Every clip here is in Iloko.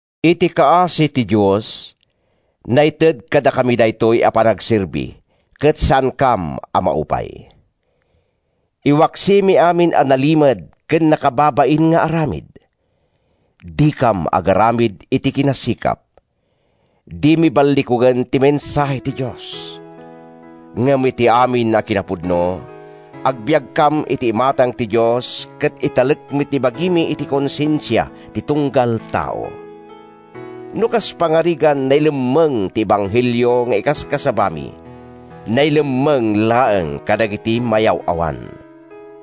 Iti kaasi ti Dios, naited kadakami daytoy a panagserbi, ket saankam a maupay. Iwaksimi amin a nalimed ken nakababain nga aramid. Dikam agaramid iti kinasikap. Dimi ballikugen ti mensahe ti Dios. Ngem iti amin a kinapudno, agbiagkam iti imatang ti Dios ket italekmi ti bagimi iti konsensia ti tunggal tao. No kas pangarigan nailemmeng ti ebanghelio nga ikaskasabami, nailemmeng laeng kadagiti mayaw-awan.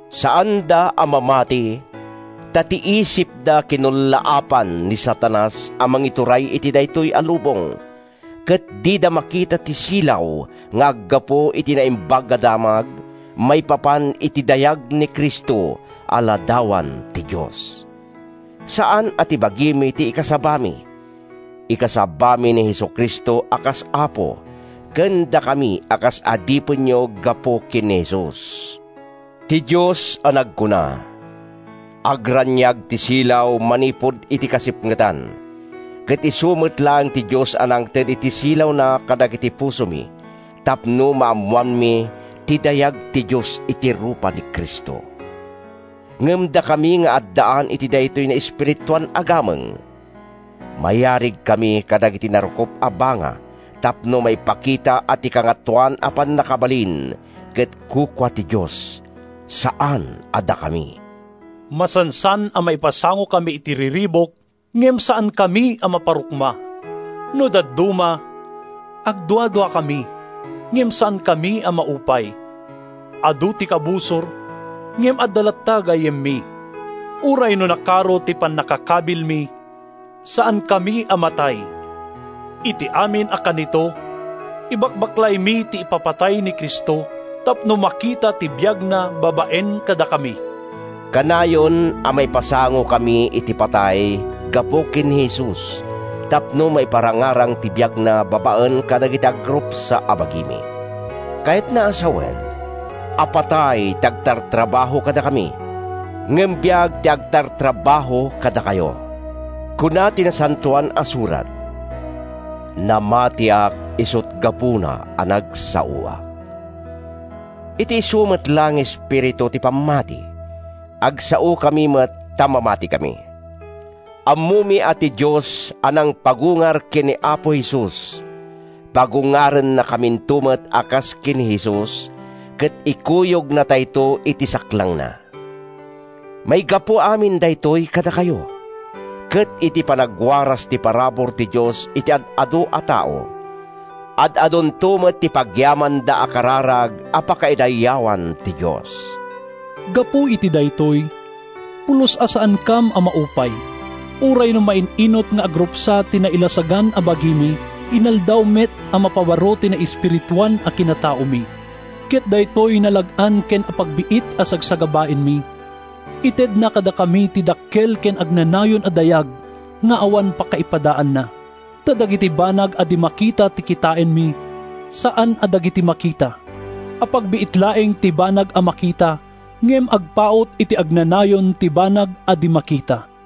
Saanda a mamati, ta ti isipda kinullaapan ni Satanas a mangituray iti daytoy a lubong, ket dida makita ti silaw nga aggapu iti Naimbag a Damag maipapan iti dayag ni Cristo a ladawan ti Dios. Saan a ti bagimi ti ikasabami: Ikasabami ni Jesu-Cristo a kas Apo, ken dakami a kas adipenyo gapu ken ni Jesus. Ti Dios a nagkuna, “Agraniag ti silaw manipud iti kasipngetan!” ket isu met laeng ti Dios a nangted iti silawna kadagiti pusomi tapno maammoanmi ti dayag ti Dios iti rupa ni Cristo. Ngem dakami nga addaan iti daytoy naespirituan a gameng, mayarigkami kadagiti narukop a banga tapno maipakita a ti kangatoan a pannakabalin ket kukua ti Dios, saan a dakami. Masansan a maipasangokami iti riribuk, ngem saankami a maparukma. No dadduma, agduaduakami, ngem saankami a maupay. Adu ti kabusor, ngem adda latta gayyemmi. Uray no nakaro ti pannakakabilmi, saankami a matay. Iti amin a kanito, ibakbaklaymi ti ipapatay ni Cristo tapno makita ti biagna babaen kadakami. Kanayon a maipasangokami iti patay gapu ken ni Jesus tapno maiparangarang ti biagna babaen kadagiti agrupsa a bagimi. Kayatna a sawen a patay ti agtartrabaho kadakami, ngem biag ti agtartrabaho kadakayo. Kuna ti Nasantoan a Surat, “Namatiak, isut’ gapuna a nagsaoak.” Iti isu met laeng nga espiritu ti pammati, agsaokami met ta mamatikami. Ammomi a ti Dios a nangpagungar ken ni Apo Jesus, pagungarennakaminto met a kas ken ni Jesus ket ikuyognatayto iti saklangna. Maigapu amin daytoy kadakayo; ket iti panagwaras ti parabur ti Dios iti ad-adu a tao, ad-adunto met ti pagyamanda a kararag a pakaidayawan ti Dios. Gapu iti daytoy, pulos a saankam a maupay. Uray no main-inut nga agrupsa ti nailasagan a bagimi, inaldaw met a mapabaro ti naespirituan a kinataomi. Ket daytoy nalag-an ken apagbiit a sagsagabaenmi, itedna kadakami ti dakkel ken agnanayon a dayag nga awan pakaipadaanna. Ta dagiti banag a di makita ti kitaenmi, saan a dagiti makita. Apagbiit laeng ti banag a makita, ngem agpaut iti agnanayon ti banag a di makita.